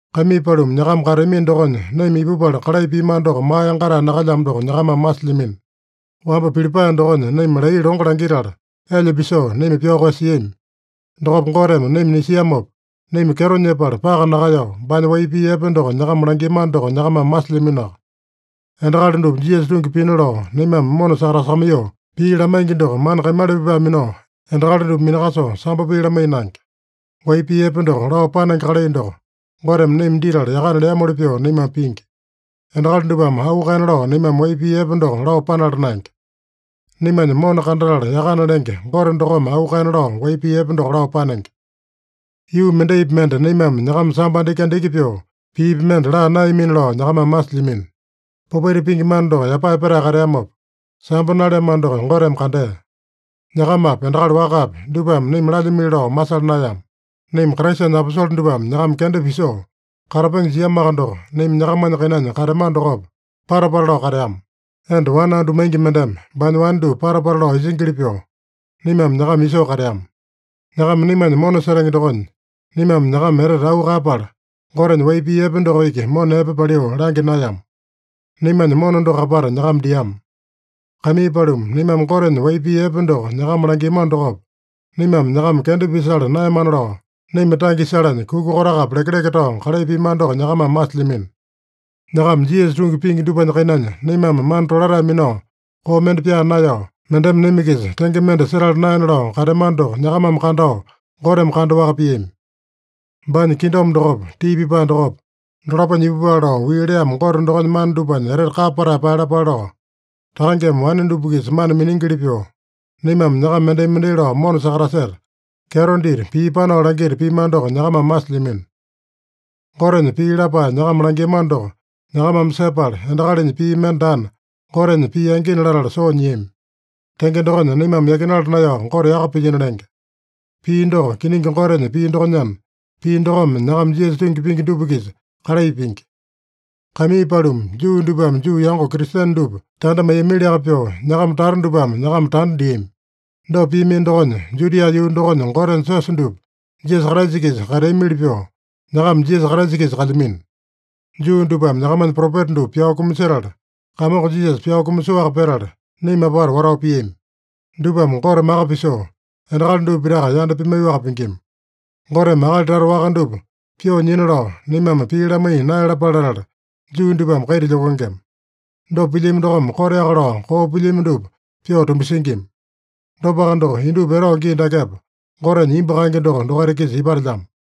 Kaimii paluma, nyakama kateamino dokonya naima ipupala kalai piamano doko maa yangatae nakalyamo doko nyakamame masilyamino. Wamba Pilipae dokonya naima laiya longo langitala, elya pisoo, naima pyao koeyasiami. Dokopa Goteme naima nisiamopa, naima kyeto nyepala paka nakaeyao, baanya wai pii epe doko nyakama langiamano doko nyakamame masilyaminoaka. Endakali dupa Jisasa tungi pina lao naimame mona sakatasakamaiyoo pii lamaingi doko, mana kaimala pipae minao endakali dupa minakasoo sambo pii lamaiya naenge. Wai pii epe doko lao panenge kalai doko, Goteme naima ditala yakana leamoli pyoo naimame pingi. Endakali dupame auu kaena lao naimame wai pii epe doko lao panala naenge. Naimanya mona kandatala yakana lenge Gote dokome auu kaena lao wai pii epe doko lao panenge. Yuu mendaipi mende naimame nyakama sambo andiki-andiki pyoo piipi mende laa naeyamina lao nyakamame masilyamino. Popaita pingi mana doko yapae petae kateamopa, sambo naleamano doko Goteme kandea. Nyakamapi, endakali wakapi, dupame naima lalyimili lao masala naeyama. Naima Kraisanya aposole dupame nyakama kenda pisoo katapenge jiamoaka doko, naima nyakamanya kainanya kateamano dokopa, pata-pata lao kateama. Enda wane andu maingi mendeme baanya wane dupa pata-pata lao isingili pyoo, naimame nyakama isoo kateama. Nyakama naimanya mona setenge dokonya, naimame nyakama etete auu kaeyapala, Gotenya wai pii epe doko iki mona epe paliu langya naeyama. Naimanya mona doko apata nyakama diama. Kaimii paluma, naimame Gotenya wai pii epe doko nyakama langiamano dokopa, naimame nyakama kenda pisala naeyamana lao, naima tange isalanya kuka kotakapi lekeleke tao kalai piamano doko nyakamame masilyamino. Nyakama Jisasa tungi pingi dupanya kainanya, naimame mana tolatae minao, koo mende pyaa naeyao, mendeme naima-kisa tenge mende setala naena lao kateamano doko nyakamame kandao, Goteme kandaowaka piami. Baanya kingdom dokopa, tii pipae dokopa, dolaponya ipupale lao wii leamo Gote dokonya mana dupanya etete kapa patae paeyalapale lao, takangeme wane dupa-kisa mana miningili pyoo, naimame nyakama mendai-mendai lao mona sakataseta, kyeto dita, pii panao langita piamano doko nyakamame masilyamino. Gotenya pii lapae nyakama langiamano doko nyakamame sepala, endakalinya pii mende daana, Gotenya pii angina latala soo nyiami. Tenge dokonya, naimame yakinala naeyao Gote yaka pilyino lenge. Pii doko, kiningi Gotenya pii dokonyana, pii dokome nyakama Jisasa tungi pingi dupa-kisa kalai pingi. Kaimii paluma, Juu dupame Juu yango Kristene dupa tanda maiyamiliaka pyoo, nyakama tata dupame nyakama tanda diami. Dopa piamino dokonya, Judia yuu dokonya Gotenya siosa dupa Jisasa Kraisa-kisa kateamili pyoo nyakama Jisasa Kraisa-kisa kalyamino. Juu dupame nyakamanya propeta dupa pyao kumasetala, Kamongo Jisasa pyao kumasoaka petala, naima apata watao piami. Dupame Gote maka pisoo, endakali dupa pitaka yanda pimaiyoaka pingima. Goteme akali tata waka dupa pyoo nyina lao, naimame pii lamaiya naeyalapale latala, Juu dupame kaita lyokengema. Dopa pilyami dokome koteaka lao koo pilyami dupa pyoo tumbasingima. Dopaka doko, indupa etao gii dakepa Gotenya imbu kaenge doko dokaita-kisa ipatelyamo.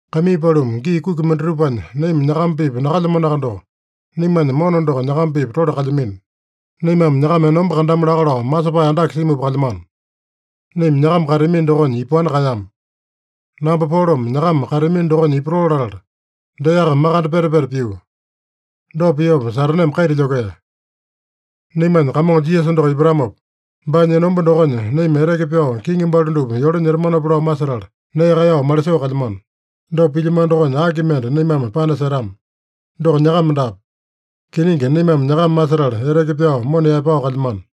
Kaimii paluma, gii kuki mendatupanya naima nyakama-pipa nakalyamanoaka doko, naimanya mona doko nyakama-pipa tole kalyamino. Naimame nyakama enomba kandamu laka lao masepae andake simupa kalyamano. Naima nyakama kateamino dokonya ipaowani kaeyama. Namba Polome nyakama kateamino dokonya ipatoo latala, deaka makande peta-peta pio. Dopa piopa Sataneme kaita lyokea. Naimanya Kamongo Jisasa doko ipatamopa, baanya enomba dokonya naima eteke pyao kiŋi balu dupa yole nyetamanopa lao masetala, nee kaeyao malisoo kalyamano. Dopa pilyamano dokonya aki mende naimame panasetama? Doko nyakama daape. Kiningi, naimame nyakama masetala eteke pyao mona yaepao kalyamano.